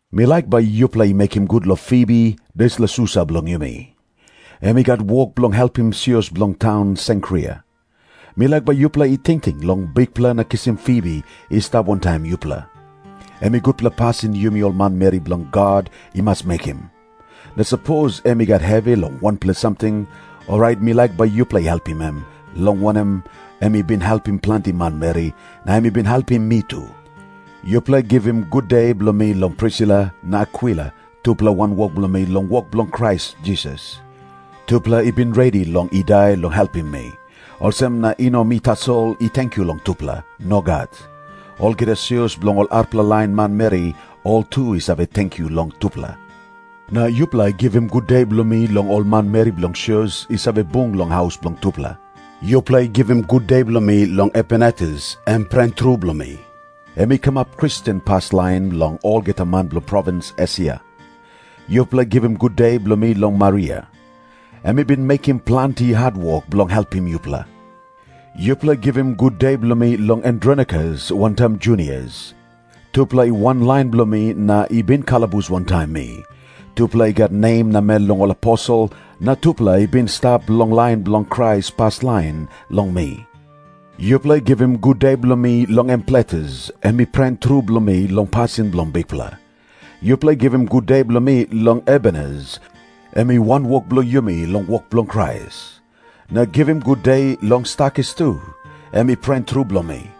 Mi laik bai yupela i mekim gut long Fibi, dispela susa bilong yumi. Em i gat wok bilong helpim sios bilong taun Senkria. Mi laik bai yupela i tingting long Bikpela na kisim Fibi i stap wantaim yupela. Em i gutpela pasin yumi ol manmeri bilong God i mas mekim. Na sapos em i gat hevi long wanpela samting, orait mi laik bai yupela i helpim em, long wanem, em i bin helpim planti manmeri, na em i bin helpim mi tu. Yupela givim gude bilong mi long Prisila na Akwila, tupela wanwok bilong mi long wok bilong Krais Jisas. Tupela i bin redi long i dai bilong helpim mi. Olsem na i no mi tasol i tenkyu long tupela. Nogat. Olgeta sios bilong ol arapela lain manmeri, ol tu i save tenkyu long tupela. Na yupela givim gude bilong mi long ol manmeri bilong sios i save bung long haus bilong tupela. Yupela givim gude bilong mi long Epainetus, em pren tru bilong mi. Em i kamap Kristen paslain long olgeta man bilong provins Esia. Yupela givim gude bilong mi long Maria. Em i bin mekim planti hatwok bilong helpim yupela. Yupela givim gude bilong mi long Andronikus wantaim Junias. Tupela i wanlain bilong mi na i bin kalabus wantaim mi. Tupela i gat nem namel long ol aposel, na tupela i bin i stap long lain bilong Krais paslain long mi. Yupela givim gude bilong mi long Ampliatus. Em i pren tru bilong mi long pasin bilong Bikpela. Yupela givim gude bilong mi long Urbanus, em i wanwok bilong yumi long wok bilong Krais. Na givim gude long Stakis tu, em i pren tru bilong mi.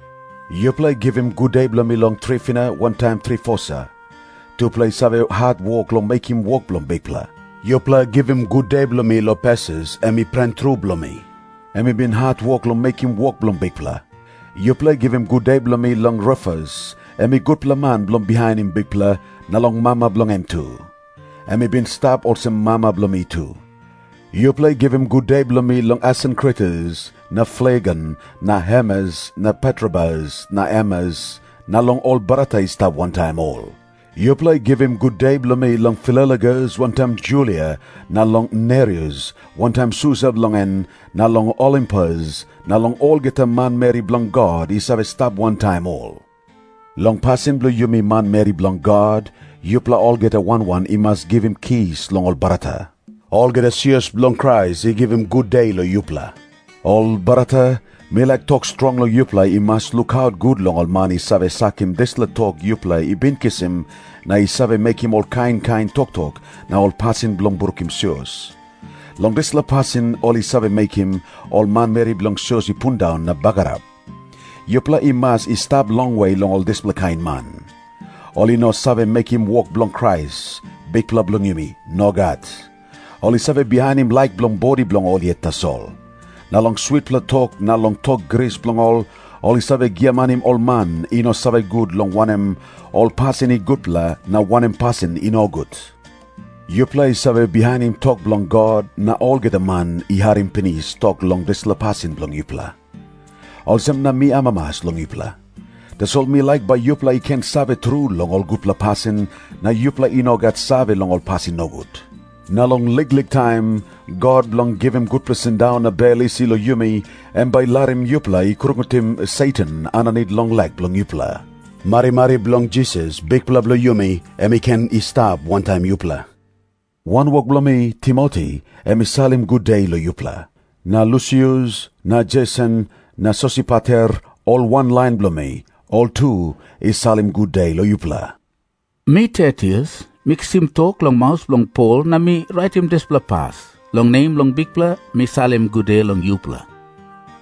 Yupela givim gude bilong mi long Trifina wantaim Trifosa. Tupela i save hatwok long mekim wok bilong Bikpela. Yupela givim gude bilong mi long Persis, em i pren tru bilong mi. Em i bin hatwok long mekim wok bilong Bikpela. Yupela givim gude bilong mi long Rufus, em i gutpela man bilong bihainim Bikpela, na long mama bilong en tu. Em i bin i stap olsem mama bilong mi tu. Yupela givim gude bilong mi long Asinkritus na Flegon na Hermes na Patrobas na Hermas, na long ol brata i stap wantaim ol. Yupela givim gude bilong mi long Filologus wantaim Julia, na long Nereus wantaim susa bilong en, na long Olimpas, na long olgeta manmeri bilong God i save stap wantaim ol. Long pasin bilong yumi manmeri bilong God, yupela olgeta wan wan i mas givim kis long ol brata. Olgeta sios bilong Krais i givim gude long yupela. Ol brata, mi laik tok strong long yupela i mas lukaut gut long ol man i save sakim dispela tok yupela i bin kisim na i save mekim ol kain kain toktok na ol pasin bilong brukim sios. Long dispela pasin ol i save mekim ol manmeri bilong sios i pundaun na bagarap. Yupela i mas i stap longwe long ol dispela kain man. Ol i no save mekim wok bilong Krais, Bikpela bilong yumi. Nogat. Ol i save bihainim laik bilong bodi bilong ol yet tasol. Na long switpela tok na long tok gris bilong ol, ol i save giamanim ol man i no save gut long wanem ol pasin i gutpela na wanem pasin i nogut. Yupela i save bihainim tok bilong God, na olgeta man i harim pinis tok long dispela pasin bilong yupela. Olsem na mi amamas long yupela. Tasol mi laik bai yupela i ken save tru long ol gutpela pasin, na yupela i no gat save long ol pasin nogut. Na long liklik taim, God bilong givim gutpela sindaun na bel isi long yumi, em bai i larim yupela i krungutim Satan aninit long lek bilong yupela. Marimari bilong Jisas, Bikpela bilong yumi, em i ken i stap wantaim yupela. Wanwok bilong mi, Timoti, em i salim gude long yupela. Na Lusius na Jeson na Sosipater, ol wanlain bilong mi, ol tu i salim gude long yupela. Mi Tertius, mi kisim tok long maus bilong Pol na mi raitim dispela pas. Long nem bilong Bikpela mi salim gude long yupela.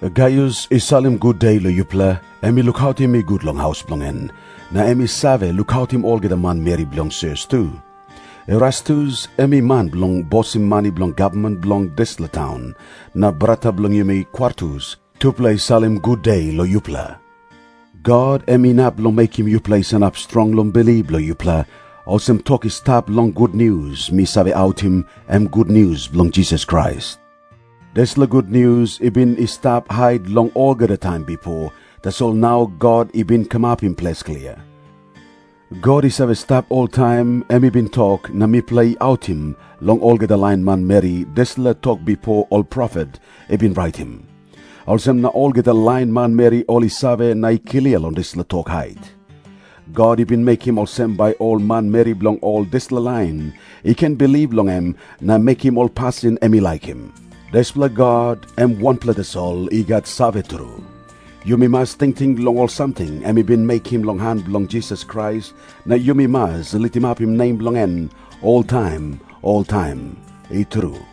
Gaius i salim gude long yupela. Em i lukautim mi gut long haus bilong en, na em i save lukautim olgeta manmeri bilong sios tu. Erastus, em i man bilong bosim mani bilong gavman bilong dispela taun, na brata bilong yumi Kwartus, tupela i salim gude long yupela. God em inap long mekim yupela i sanap strong long bilip bilong yupela, olsem tok i stap long gutnius mi save autim, em gutnius bilong Jisas Krais. Dispela gutnius i bin i stap hait long olgeta taim bipo, tasol nau God i bin kamapim ples klia. God i save stap oltaim, em i bin tok, na mipela i autim long olgeta lain manmeri dispela tok bipo ol profet i bin raitim. Olsem na olgeta lain manmeri ol i save na i klia long dispela tok hait. God i bin mekim olsem bai ol manmeri bilong ol dispela lain i ken bilip long em na mekim ol pasin em i laikim. Dispela God, em wanpela tasol i gat save tru. Yumi mas tingting long ol samting em i bin mekim long han bilong Jisas Krais, na yumi mas litimapim nem bilong en oltaim oltaim. I tru.